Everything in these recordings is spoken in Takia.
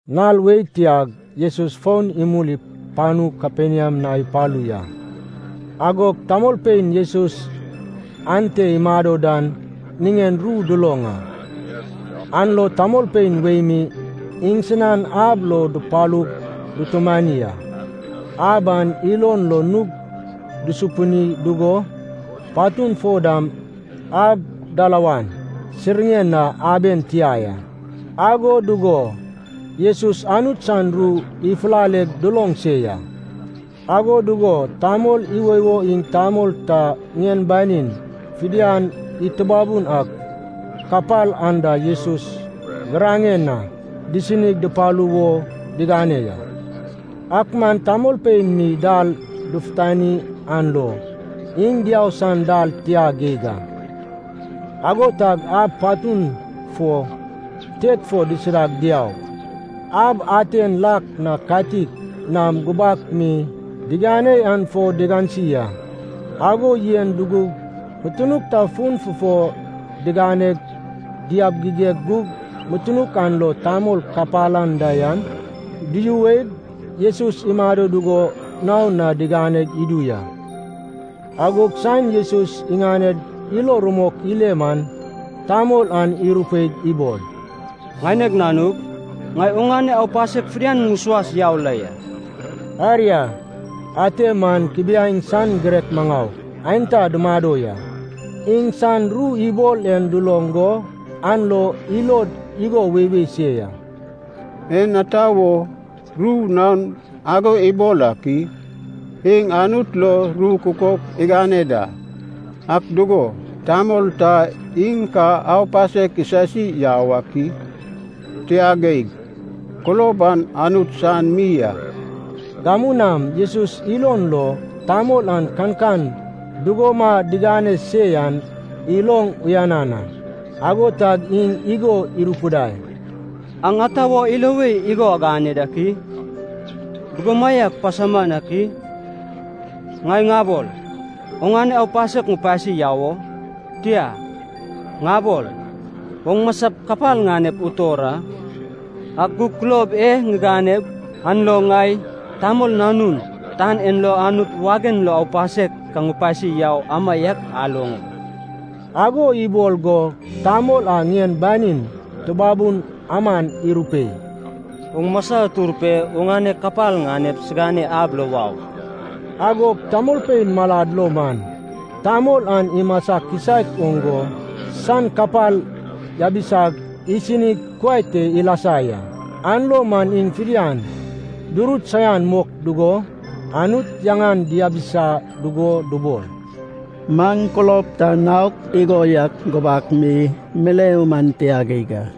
Nal wei tiag Jesus fon imul panu Kaperniam na ipalu ya. Agog tamolpein Jesus ante imado dan niŋen ru duloŋ a. An lo tamolpein wei mi iŋsinan ab lo dupalug dutumani a. Ab an ilon lo nug dusupini dugo patun fo dam ab dalawan siŋiren na aben tia ya. Ago dugo Jesus Anut san ru ifulaleg duloŋ se ya. Ago dugo tamol iwoiwo iŋ tamol ta ŋien banin fidian itubabun ak kapal anda Jesus giraŋen na disinig dupalu wo digane ya. Ak man tamolpein mi dal dufutani an lo iŋ diau san dal tia geig a. Ago tag ab patun fo tet fo disidag diaug, ab aten lak na katik nam gubak mi digane an fo digansi a. Ago yen dugug mutunuk ta fuŋ fufo diganeg diabigigeg gug mutunuk an lo tamol kapal anda yan duyuweg, Jesus imado dugo naon na digane idu ya. Agog saen Jesus iŋaned ilo rumok ile man tamol an irupeig ibol, “Ŋaineg nanug, ŋai oŋane aupasek fidian ŋusuas yau la ya.” Aria, ate man kubiaeŋ san girek maŋau aenta dumado ya. Iŋsan ru ibol en duloŋ go an lo ilod igo weiwei se ya. “En ata wo ru naon ago ibol ak i? Iŋ Anut lo ru kukok igane da! Ak dugo, tamol ta iŋ ka aupasek isasi yau ak i? Tia geig, kulob an Anut san mi a.” Gamu nam Jesus ilon lo, tamol an kankan dugoma digane se yan iloŋ uyanan a. Ago tag iŋ igo irupidai, “Aŋ ata wo ilo wei igo agane dak i? Dugomaiak pasauman ak i? Ŋai ŋabol, ‘Oŋane aupasek ŋupasi yau o?’ Tia, ŋabol, ‘Oŋ masap kapal ŋanep utor a?’ Ak gug kulob e ŋiganep an lo ŋai, Tamol Nanun, tan en lo Anut wagen lo aupasek ka ŋupasi yau amaiak aloŋ o...” ago ibol go tamol a ŋien banin tubabun aman irupei, “Oŋ masa utur pe oŋane kapal ŋanep siŋane ab lo wau.” Agog tamolpein malad lo man, tamol an imasa kisaek oŋ go san kapal yabisag isinig kuai te ilasa ya. An lo man iŋ fidian durut saian mok dugo Anut yaŋan diabisa dugo dubol, “Maŋ kulob ta naok igo yak gubak mi mileu man tia geig a!”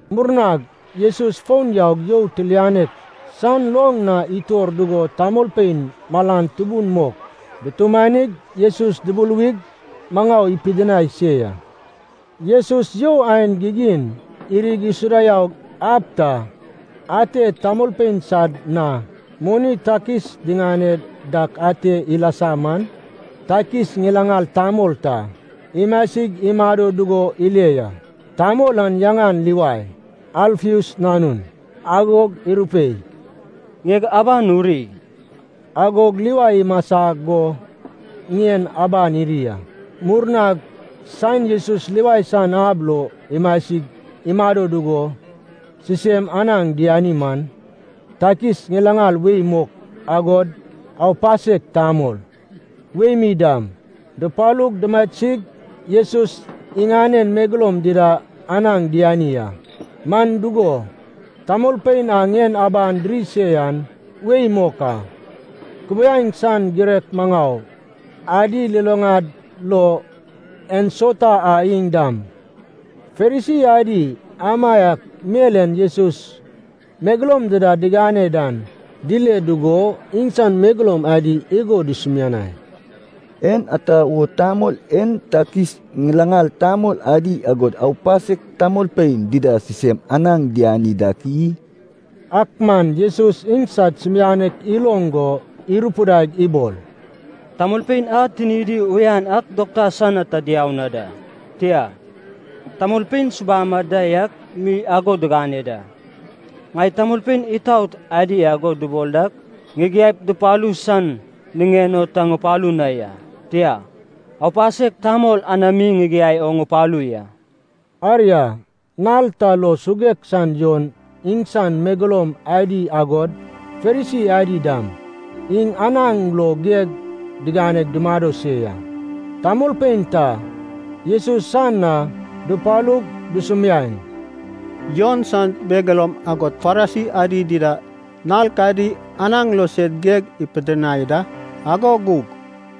Murnag Jesus fon yaug you tilianek san loŋ na itor dugo tamolpein malan tubun mok dutumanig Jesus dubuluwig maŋau ipidinai se ya. Jesus you aen gigin irig isuda yaug ab ta, ate tamolpein sad na moni takis diŋane dak ate ilasa man, takis ŋilaŋal tamol ta imasig imado dugo ile ya. Tamol an yaŋan Livai, Alfeus nanun. Agog irupei, “Ŋieg aban uri.” Agog Livai imasa go ŋien aban iri a. Murnag saen Jesus Livai san ab lo imasig imado dugo sisem anaŋ diani man, takis ŋilaŋal wei mok agod “aupasek tamol” wei mi dam, dupalug dumasig Jesus iŋanen megeloum dida anaŋ diani a. Man dugo, tamolpein a ŋien aban diri se yan wei mok a. Kubiaeŋ san girek maŋau adi luluŋad lo ensauta a iŋ dam Farisi adi amaiak mel en Jesus megeloum dida digane dan dile dugo iŋsan megeloum adi igo dusumianai, “En ata wo tamol en takis ŋilaŋal tamol adi agod aupasek tamolpein dida sisem anaŋ diani dak i?” Ak man Jesus iŋsad sumianek iloŋ go irupidaig ibol, “Tamolpein a tinidi uyan an dokta san na ta diau na da, tia, tamolpein subam anda yak mi ago digane da. Ŋai tamolpein itaot adi ago dubol dak ŋigiaip dupalu san niŋen o ta ŋupalu na ya, tia, aupasek tamol anami ŋigiai o ŋupalu ya.” Aria, nal ta lo suguek san Jon iŋsan megeloum adi agod Farisi adi dam iŋ anaŋ lo geg diganeg dumado se ya. Tamolpein ta Jesus san na dupalug dusumiaeŋ, “Jon san megeloum agod Farisi adi dida nal kadi anaŋ lo sed geg ipidinai da, ago gug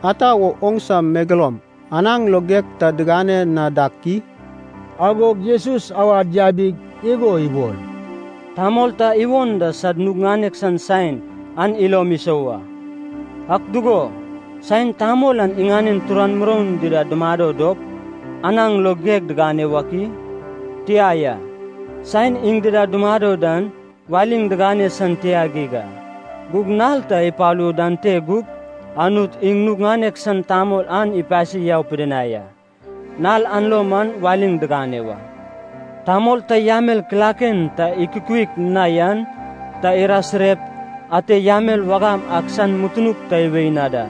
ata wo oŋsiŋane megeloum anaŋ lo geg ta digane na dak i?” Agog Jesus awad yabig igo ibol, “Tamol ta iwon da sad nug ŋanek san saen an ilom isou a. Ak dugo, saen tamol an iŋanen turan muroun dida dumado dop, anaŋ lo geg digane wak i? Tia ya. Saen iŋ dida dumado dan waliŋ digane san tia geig a. Gug nal ta ipalu dan te gup, Anut iŋ nug ŋanek san tamol an ipasi yau pidinai a, nal an lo man waliŋ digane wa.” “Tamol ta yamel kilaken ta ikukuik na yan ta irasirep ate yamel wagam ak san mutunuk ta iwei na da.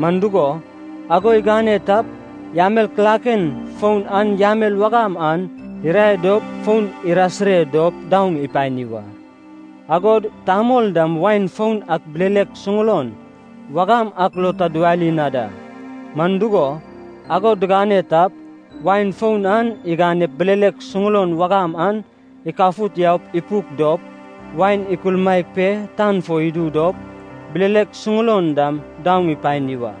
Man dugo, ago igane tap, yamel kilaken foun an yamel wagam an irae dop fon irasire dop daoŋ ipani wa. Agod tamol dam wain foun ak bilelek suŋulon wagam ak lo ta diwali na da. Man dugo, ago digane tap, wain foun an iganep bilelek suŋulon wagam an ikafut yaup ipuk dop, wain ikulmaek pe tan fo idu dop, bilelek suŋulon dam daoŋ ipani wa.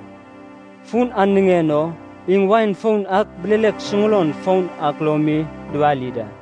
Fun an niŋen o iŋ wain foun ak bilelek suŋulon foun ak lo mi diwali da.”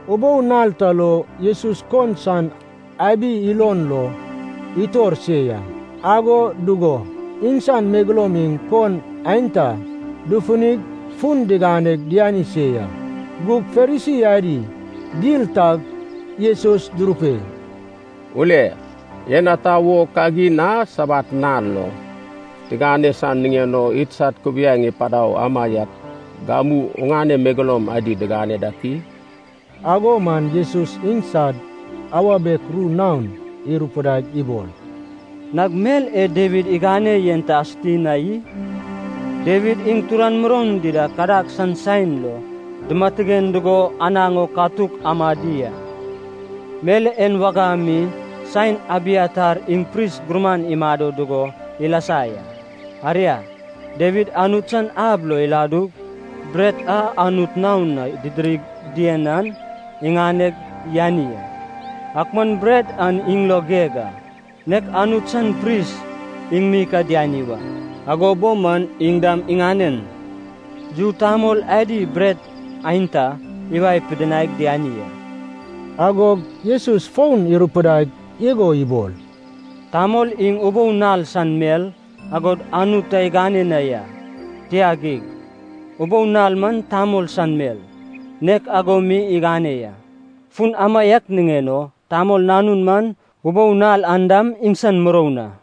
Ubou nal ta lo Jesus kon san abi ilon lo itor se ya. Ago dugo iŋsan megeloum iŋ kon aenta dufunig fun diganeg diani se ya. Gug Farisi adi dil tag Jesus durupei, “Ule, en ata wo kagin a Sabat nal lo tigane san niŋen o idsad kubiaeŋ ipadau amaiak gamu oŋane megeloum adi digane dak i?” Ago man Jesus iŋsad awa biek ru naon irupidaig ibol, “Nag mel e Dawid igane yen ta asuti na i? Dawid iŋ turan muroun dida kadag san saen lo dimatigen dugo anaŋ o katuk amadi a. Mel en wagam mi saen Abiatar iŋ pris gurman imado dugo ilasa ya. Aria, Dawid Anut san ab lo iladug, bret a Anut naon na didirig dien an iŋaneg yani a. Ak man bret an iŋ lo geg a, nek Anut san pris iŋ mi ka diani wa. Ago bo man iŋ dam iŋanen yu tamol adi bret aenta iwae pidinaig diani a.” Agog Jesus fon irupidaig igo ibol, “Tamol iŋ ubou nal san mel, ago Anut ta igane na ya, tia geig. Ubou nal man tamol san mel, nek ago mi igane ya. Fun amaiak niŋen o, Tamol Nanun man ubou nal an dam iŋsan muroun a.”